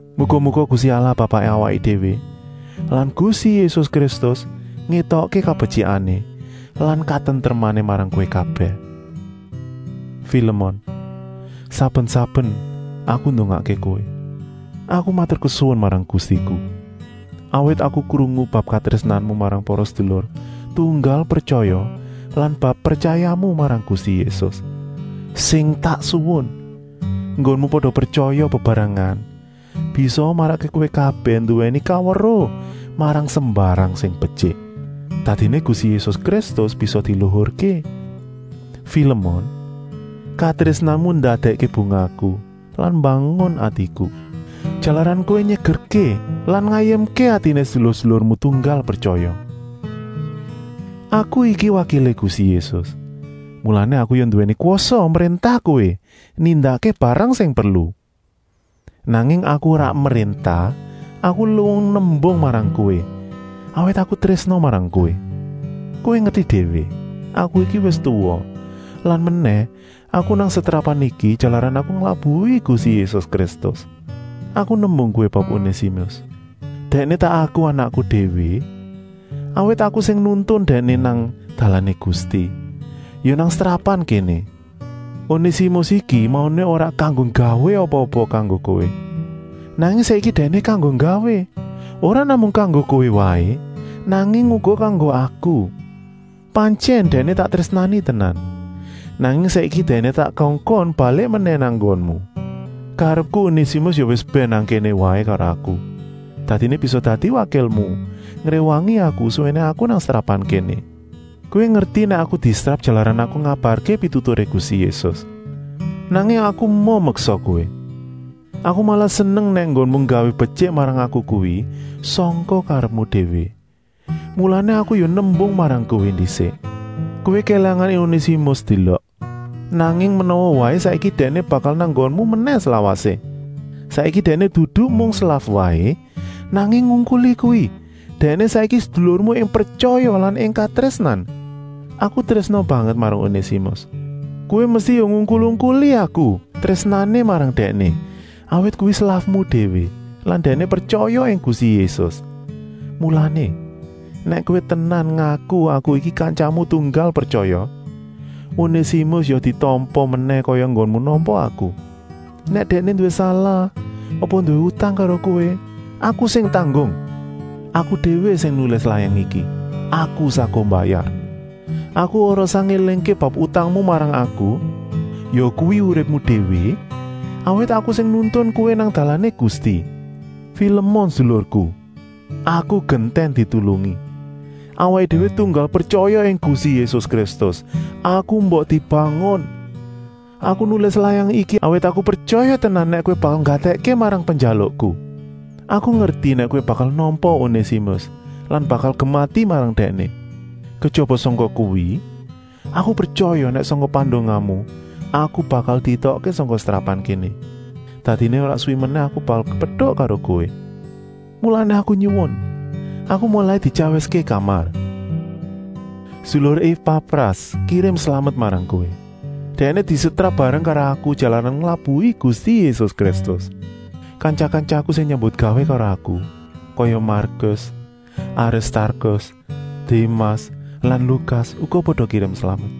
Muga-muga Gusti Allah Bapaké awaké déwé lan Gusti Yésus Kristus ngétokké kabetyikané lan katentremané marang kowé kabèh. Filemon, saben-saben aku ndongakké kowé, aku maturkesuwun marang Gustiku, awit aku krungu bab katrésnanmu marang para sedulur tunggal pretyaya lan bab pretyayamu marang Gusti Yésus. Sing tak suwun, enggonmu pada pretyaya bebarengan bisaa marakké kowé kabèh nduwèni kaweruh marang sembarang sing betyik. Dadiné Gusti Yésus Kristus bisa diluhurké. Filemon, katrésnanmu ndadèkké bungahku lan mbangun atiku, jalaran kowé nyegerké lan ngayemké atiné sedulur-sedulurmu tunggal pretyaya. Aku iki wakilé Gusti Yésus, mulané aku ya nduwèni kwasa mréntah kowé nindakké barang sing perlu. Nanging aku ora mréntah, aku luwung nembung marang kowé, awit aku trésna marang kowé. Kowé ngerti déwé, aku iki wis tuwa lan menèh aku nang setrapan iki jalaran aku nglabuhi Gusti Yésus Kristus. Aku nembung kowé bab Onésimus. Dèkné tak aku anakku déwé, awit aku sing nuntun dèkné nang dalané Gusti, ya nang setrapan kéné. Onésimus iki mauné ora kanggo gawé apa-apa kanggo kowé, nanging saiki dèkné kanggo gawé, ora namung kanggo kowé waé, nanging uga kanggo aku. Pantyèn dèkné tak trésnani tenan, nanging saiki dèkné tak kongkon balik menèh nang nggonmu. Karepku Onésimus ya wis bèn nang kéné waé karo aku, dadiné bisa dadi wakilmu ngréwangi aku suwéné aku nang setrapan kéné. Kowé ngerti nèk aku disetrap jalaran aku ngabarké pituturé Gusti Yésus. Nanging aku emoh meksa kowé. Aku malah seneng nèk enggonmu nggawé betyik marang aku kuwi sangka karepmu déwé. Mulané aku ya nembung marang kowé ndisik. Kowé kélangan Onésimus sedélok, nanging menawa waé saiki dèkné bakal nang nggonmu menèh slawasé. Saiki dèkné dudu mung slaf waé, nanging ngungkuli kuwi, dèkné saiki sedulurmu ing pretyaya lan ing katrésnan. Aku trésna banget marang Onésimus, kowé mesti ya ngungkul-ungkuli aku trésnané marang dèkné, awit kuwi slafmu déwé lan dèkné pretyaya ing Gusti Yésus. Mulané, nèk kowé tenan ngaku aku iki kantyamu tunggal pretyaya, Onésimus ya ditampa menèh kaya enggonmu nampa aku. Nèk dèkné nduwé salah apa nduwé utang karo kowé, aku sing tanggung. Aku, Paulus, aku déwé sing nulis layang iki, aku saguh mbayar. Aku ora usah ngélingké bab utangmu marang aku, yakuwi uripmu déwé, awit aku sing nuntun kowé nang dalané Gusti. Filemon sedulurku, aku gentèn ditulungi. Awaké déwé tunggal pretyaya ing Gusti Yésus Kristus, aku mbok dibangun. Aku nulis layang iki, awit aku pretyaya tenan nèk kowé bakal nggatèkké marang penjalukku. Aku ngerti nèk kowé bakal nampa Onésimus lan bakal gemati marang dèkné. Kejaba sangka kuwi, aku pretyaya nèk sangka pandongamu aku bakal dietokké sangka setrapan kéné. Dadiné ora suwi menèh aku bakal kepetuk karo kowé. Mulané aku nyuwun, aku molai dityawiské kamar. Sedulur Epafras kirim slamet marang kowé. Dèkné disetrap bareng karo aku jalaran nglabuhi Gusti Yésus Kristus. Kantya-kantyaku sing nyambutgawé karo aku, kaya Markus, Aristarkus, Démas lan Lukas uga pada kirim slamet.